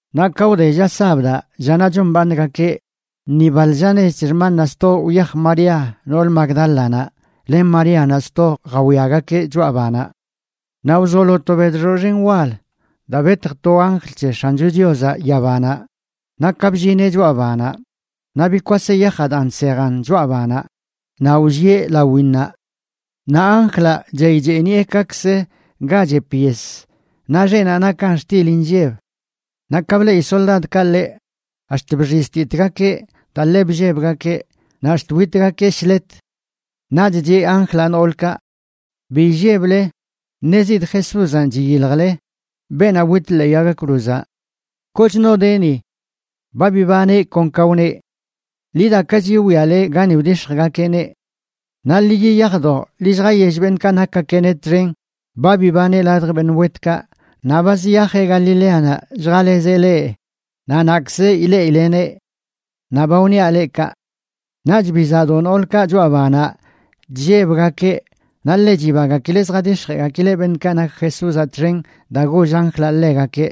Naꞌ ka wde lla sabdaꞌ, llanaꞌ chombaaṉgakeꞌ, ni baḻ lla nech c̱he xmannaꞌ sto, wyaj María nool Magdálanaꞌ, len Maríanaꞌ sto jawiagakeꞌ choꞌa banaꞌ. Naꞌ wzolo to bedxoꞌ xen wal daa betj to anjl c̱he X̱ancho Chiozaꞌ yabanaꞌ, naꞌ ka bllineꞌ choꞌa banaꞌ naꞌ bikwaseꞌ yajaꞌ daa nsejan choꞌa banaꞌ naꞌ wllieꞌ lawinnaꞌ. Naꞌ anjlaꞌ chey cheeniꞌe kakzə ga chep yes naꞌ xeꞌnaꞌ nakan xtil inlleb. Naꞌ ka bleꞌi soldadkaꞌ ḻeꞌ ax̱t bxiztitgakeꞌ daa ḻe bllebgakeꞌ naꞌ ax̱t witgakeꞌ shlet. Naꞌch cheꞌ anjlaꞌ noolkaꞌ: ―Bi illeble. Ṉezidꞌ Jesúzanꞌ chiyiljle, beenaꞌ wit ḻee yag cruzaꞌ. Koch no de ni. Ba bibaneꞌ kon ka wneꞌ. Ḻi dakachi wwiale gani wdix̱jgakeꞌneꞌ. Naꞌ ḻi yiyajdo ḻi lljayell beṉꞌkaꞌ nakgakeꞌneꞌ txen: “Ba bibaneꞌ ladj beṉꞌ wetkaꞌ naꞌ ba ziyajeꞌ Galileanaꞌ lljalezeꞌ leꞌ, naꞌ naꞌkzə ileꞌileneꞌ.” Naꞌ ba wniaꞌ leꞌ kaꞌ. Naꞌch bizaꞌdo noolkaꞌ choꞌa banaꞌ chllebgakeꞌ naꞌ ḻe chibagakileꞌ zjadix̱jeꞌgakileꞌ beṉꞌkaꞌ nak Jesúzaꞌ txen daa goll anjlaꞌ ḻegakeꞌ.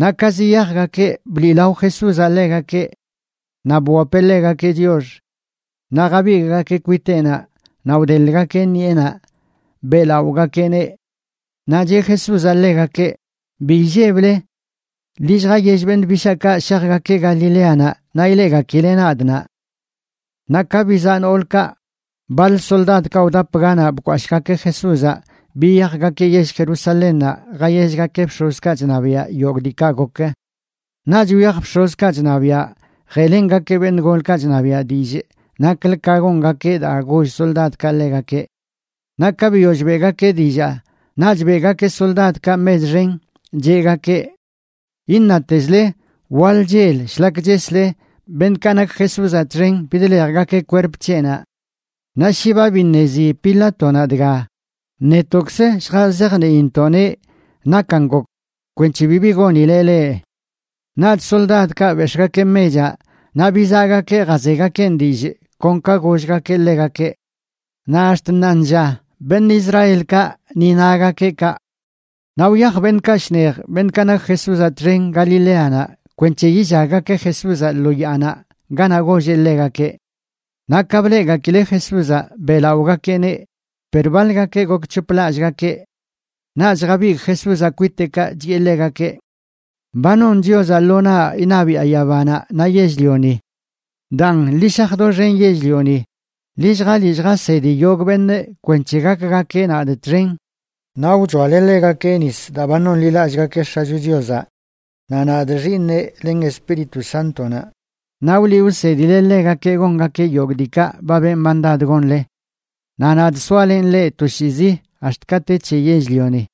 Naꞌ ka ziyajgakeꞌ, bliꞌlao Jesúzaꞌ ḻegakeꞌ naꞌ bwapeꞌ ḻegakeꞌ chiox. Naꞌ jabigꞌgakeꞌ kwiteꞌnaꞌ naꞌ wdeḻꞌgakeꞌ ṉiꞌenaꞌ beꞌlaꞌogakeꞌneꞌ. Naꞌ cheꞌ Jesúzaꞌ ḻegakeꞌ: ―Bi illeble. Ḻi lljayell beṉꞌ bishaakaꞌ shajgakeꞌ Galileanaꞌ naꞌ ileꞌgakileꞌ nadꞌ naꞌ. Naꞌ ka bizaꞌ noolkaꞌ, baḻ soldadkaꞌ wdap ganaꞌ bkwashꞌgakeꞌ Jesúzaꞌ biyajgakeꞌ yell Jerusalénnaꞌ jayellgakeꞌ bx̱ozkaꞌ chṉabiaꞌ yogꞌ diikaꞌ gok. Naꞌch wyaj bx̱ozkaꞌ chṉabiaꞌ jeꞌlengakeꞌ beṉꞌ golkaꞌ chṉabiaꞌ dillꞌ naklə ka gongakeꞌ daa goll soldadkaꞌ ḻegakeꞌ. Naꞌ ka biyoll beꞌgakeꞌ dillaa, naꞌch beꞌgakeꞌ soldadkaꞌ mech xen, cheꞌgakeꞌ: ―Iṉatezle waḻ chel shlak chesle, beṉꞌkaꞌ nak Jesúzaꞌ txen bidḻejgakeꞌ kwerp c̱heꞌnaꞌ. Naꞌ shi ba biṉezi Pilátonaꞌ dga, netoꞌkzə lljazajniintoꞌneꞌ nakan gok kwenc̱he bibi gonileꞌ leꞌ. Naꞌch soldadkaꞌ bex̱ꞌgakeꞌ mechaꞌ naꞌ bizaꞌgakeꞌ jazegakeꞌn dillꞌ kon ka gollgakeꞌ ḻegakeꞌ. Naꞌ ax̱t ṉaanlla beṉꞌ Israelkaꞌ ni nagakeꞌ kaꞌ. Naꞌ wyaj beṉꞌkaꞌ shnej, beṉꞌkaꞌ nak Jesúzaꞌ txen, Galileanaꞌ kwenc̱he yillaggakeꞌ Jesúzaꞌ lo yaanaꞌ ganaꞌ golleꞌ ḻegakeꞌ. Naꞌ ka bleꞌgakileꞌ Jesúzaꞌ, beꞌlaꞌogakeꞌneꞌ, per baḻgakeꞌ gokc̱hoplallꞌgakeꞌ. Naꞌch jabigꞌ Jesúzaꞌ kwiteꞌkaꞌ, chiꞌe ḻegakeꞌ: ―Ba non Chiozaꞌ lo naꞌ iṉabiꞌa yabanaꞌ naꞌ yell-lioni. Daan, ḻi shaj doxen yell-lioni, ḻi lljaliꞌ lljasedi yogꞌ beṉꞌ kwenc̱he gakgakeꞌ nadꞌ txen. Naꞌ wchoale ḻegakeꞌ nis daa ba nonḻilallꞌgakeꞌ X̱acho Chiozaꞌ, naꞌ nadꞌ, Xiiṉeꞌ, len Espíritu Sántonaꞌ. Naꞌ wliꞌ wsedile ḻegakeꞌ gongakeꞌ yogꞌ diikaꞌ ba benꞌ mandad gonle. Naꞌ nadꞌ soalenꞌ leꞌ toshiizi ax̱t ka te c̱he yell-lioni.